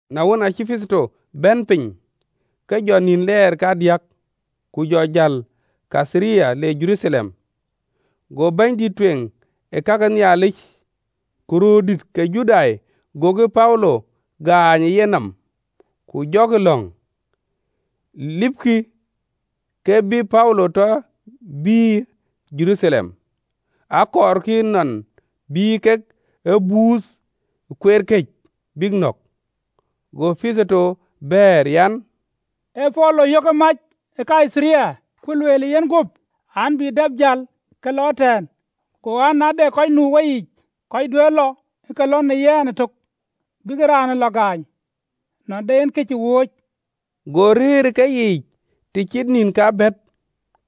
Na wën, aacï Petheto bɛ̈n piny, ke jɔ nïn lɛɛr kadiäk, ku jɔ jäl Kaitharia le Jeruthalem. Go bɛ̈nydïït ë kake Nhialic ku röördït ke Judai gokï Paulo gaany ë yenɔm, ku jɔkï lɔ̈ŋ, lipkï, ke bï Paulo tɔ bïïyë Jeruthalem, akɔɔrkï nɔn bï kek e buuth ë kueer këc, ke bïk nɔ̈k. Go Petheto bɛ̈ɛ̈r an, “Ë Paulo yök ke mac ë Kaitharia, ku lueel ë yenguöp, an, bï dap jäl, ke lɔ tɛ̈ɛ̈n. Go, an, na de kɔc nu ë weyiic, kɔc duëër lɔ Kaitharia, ë ke lɔ në yɛn ëtök, bïk raanë lɔ gaany, nɔn de yen kë cï wööc.” Go rëër ë keyiic të cït nïn kabɛ̈t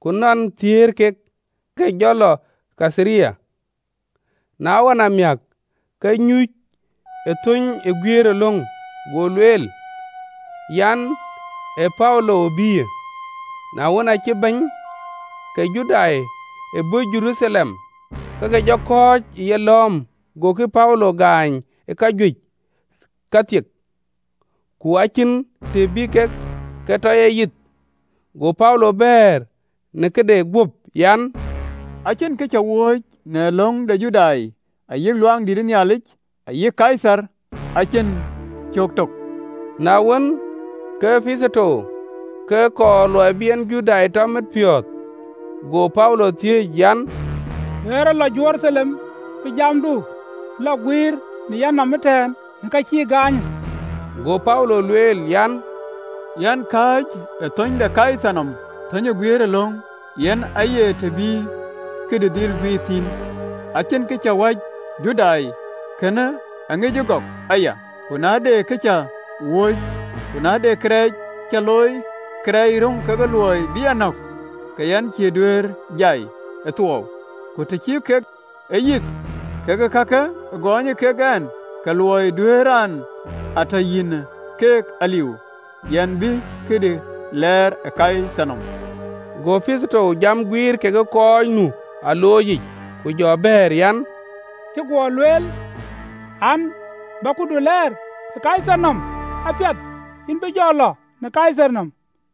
ku nɔn thiëër kek, ku jɔ lɔ Kaitharia, na ɣɔn amiäk, ke nyuc ë thööny ë guiëërëlöŋ nɔm, go lueel an, ë Paulo bïïyë. Na wën, aacï bɛ̈n, ke Judai ë bɔ̈ ë Jeruthalem, ke ke jɔ kɔ̈ɔ̈c ë yelɔ̈ɔ̈m, gokï Paulo gaany ë kajuëc kathiek, ku acïn të bï kek ke tɔ ye yith. Go Paulo bɛ̈ɛ̈r në këde guöp an, “Acïn kërɛɛc cä wööc në löŋ de Judai, ayï Luaŋdït, ayï Kaithar, acïn cöök tök.” Na wën, ke Petheto, ke kɔɔr luɔi bï en Judai tɔ mit piɔ̈ɔ̈th, go Paulo thiëëc an, “Duɛ̈ɛ̈rë lɔ Jeruthalem, bï jamdu lɔ guiir ë yanɔm ëtɛ̈ɛ̈n, në ka cï yï gaanyë?” Go Paulo lueel an, “Yɛn kääc ë thööny de Kaithar nɔm, thööny ë guiëërëlöŋ, yen aye të bï këdï dhil guiir thïn. Acïn kë cä wäc Judai, kënë aŋic ë gɔk aya. Ku na de kë cä wööc, ku na de kërɛɛc cä looi kërɛɛc röŋ ke luɔi bï a nɔ̈k, ke yɛn cïï duëër jai ë thuɔɔu. Ku të cïï kek ee yith, kek kak ë gɔɔny kek ɛn, ke luɔi duëër raan a tɔ yïnë keek aliu. Yɛn bï këdï lɛɛr ë Kaithar nɔm.” Go Petheto jam guiir kekë kɔc nu ë löŋic, ku jɔ bɛ̈ɛ̈r an, “Cï guɔ lueel, an, bä këdu lɛɛr ë Kaithar nɔm? Apiɛth, yïn bï jɔ lɔ ë Kaithar nɔm.”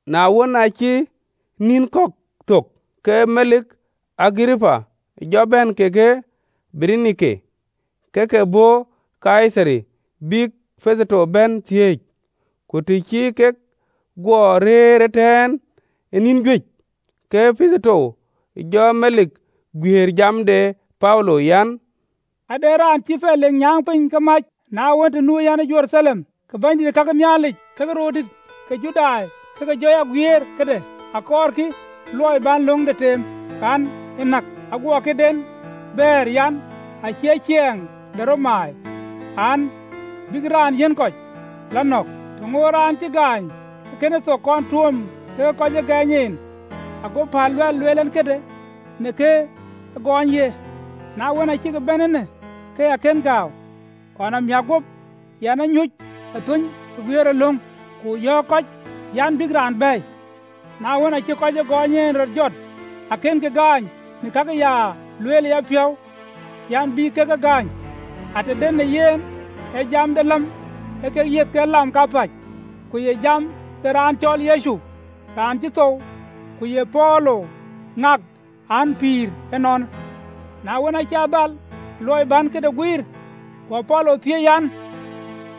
Na wën, aacï nïn kɔ̈k thök, ke melik Agiripa jɔ bɛ̈n kekë Berenike, ke ke bɔ̈ Kaitharia, bïk Petheto bɛ̈n thiëëc. Ku të cï kek guɔ rëër ëtɛ̈ɛ̈n ë nïn juëc, ke Petheto jɔ melik guiëër jam de Paulo an, “Ade raan cïï Pelik nyääŋ piny ke mac, na wën, të nuö yɛn Jeruthalem, ke bänydït ke ka ke Nhialic kekë röördït ke Judai ke ke jɔ ya guiëër këde, akɔɔrkï luɔi bän löŋde teem an, ë näk. Aguɔ këden bɛ̈ɛ̈r an, Acie ciɛɛŋ de Romai an, bïk raan yiɛ̈n kɔc, le nɔ̈k, të ŋootë raan cï gaany ke kën e thok kɔn tuööm kekë kɔc gɔɔny en, ago päl luɛl lueel en këde në kë ë gɔɔnyë ye. Na wën, aa cïk bɛ̈n eenë, ke ya kɛ̈n gääu, ɣɔn amiäk guöp yɛn ë nyuc ë thööny ë guiëërëlöŋ nɔm, ku yɔ̈ɔ̈k kɔc an, bïk raan bɛ̈ɛ̈i. Na wën, aacï kɔc gɔɔny en röt jɔt, akënkï gaany në kak ë ya lueel ë yapiɔ̈u an, bï kek e gaany. Aterden në yen ee jam de lam ee kek yiëthken lam kapäc, ku ye jam de raan cɔl Yecu, raan cï thou, ku ye Paulo ŋak an, pïïr ënɔɔnë. Na wën, aacï a dhal luɔi bän këde guiir, guɔ Paulo thiëëc an,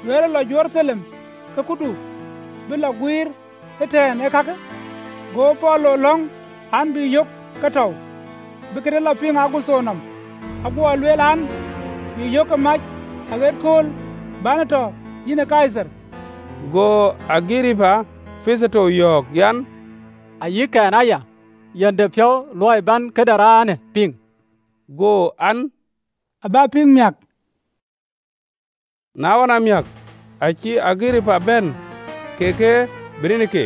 duɛ̈ɛ̈rë lɔ Jeruthalem, ke këde bï lɔ guiir ëtɛ̈ɛ̈n në kake. Go Paulo lɔ̈ŋ an, bï yök ke tɔ̈u, bï këde lɔ piŋ ë Kaithar nɔm, aguɔ lueel an, bï yök ke mac aɣet kööl bän e tɔ yïnë Kaithar.” Go Agiripa Petheto yɔ̈ɔ̈k an, “Ayïk ɛn aya, yɛn de piɔ̈u luɔi bän këde raanë piŋ.” Go, an, “Abä piŋ miäk.” Na ɣɔn amiäk, aacï Agiripa bɛ̈n kekë Berenike,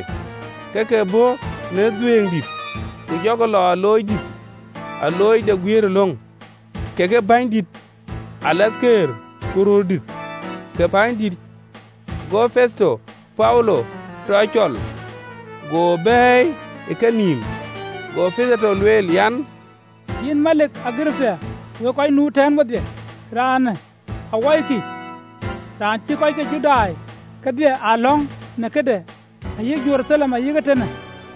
ke ke bɔ̈ në dhuëëŋ dït, ku jɔkï lɔ aloocdït alooc de guiëërëlöŋ, kekë bänydït ke rem de tɔŋ ku röördït ke pänydït, go Petheto Paulo tɔ cɔl, go bɛ̈ɛ̈i ë kenïïm. Go Petheto lueel, an, “Yïn melik Agiripa, wekë kɔc nu ee tënë wedhie, raanë a wɔikï, raan cïï kɔc ke Judai kedhie a löŋ në këde, ayï Jeruthalem ayï ee tënë,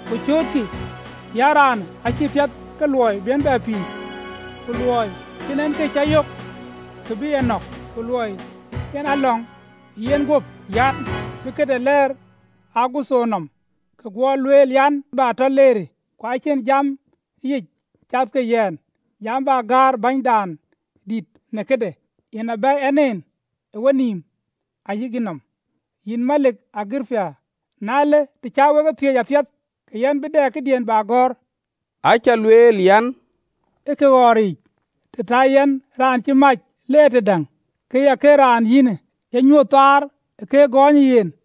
ku cötkï an, raanë acïï piɛth ke luɔi bï en bɛ pïïr. Ku luɔi cïn en kë cä yök, kë bï e nɔ̈k, ku luɔi cï en a lɔ̈ŋ, yenguöp an, bï këde lɛɛr në Augutho nɔm, ke guɔ lueel an, bä tɔ leerë. Ku acïn jam yic cath ke yɛn, jam bä gäär bɛ̈nydan dït në këde. Yen a bɛ̈ɛ̈i ɛn en ë wenïïm, ayïk yïnɔm, yïn melik Agiripa, na ëlë, të cä wek e thiëëc apiɛth, ke yɛn bï dɛ këdiën bä gɔ̈ɔ̈r. Guɔ lueel an, ee kë ɣɔ̈ric, të ta yɛn raan cï mac leerë tëdäŋ, ke ya kën raan yïnë ye nyuöth thar ë kë ë gɔɔnyë yen.”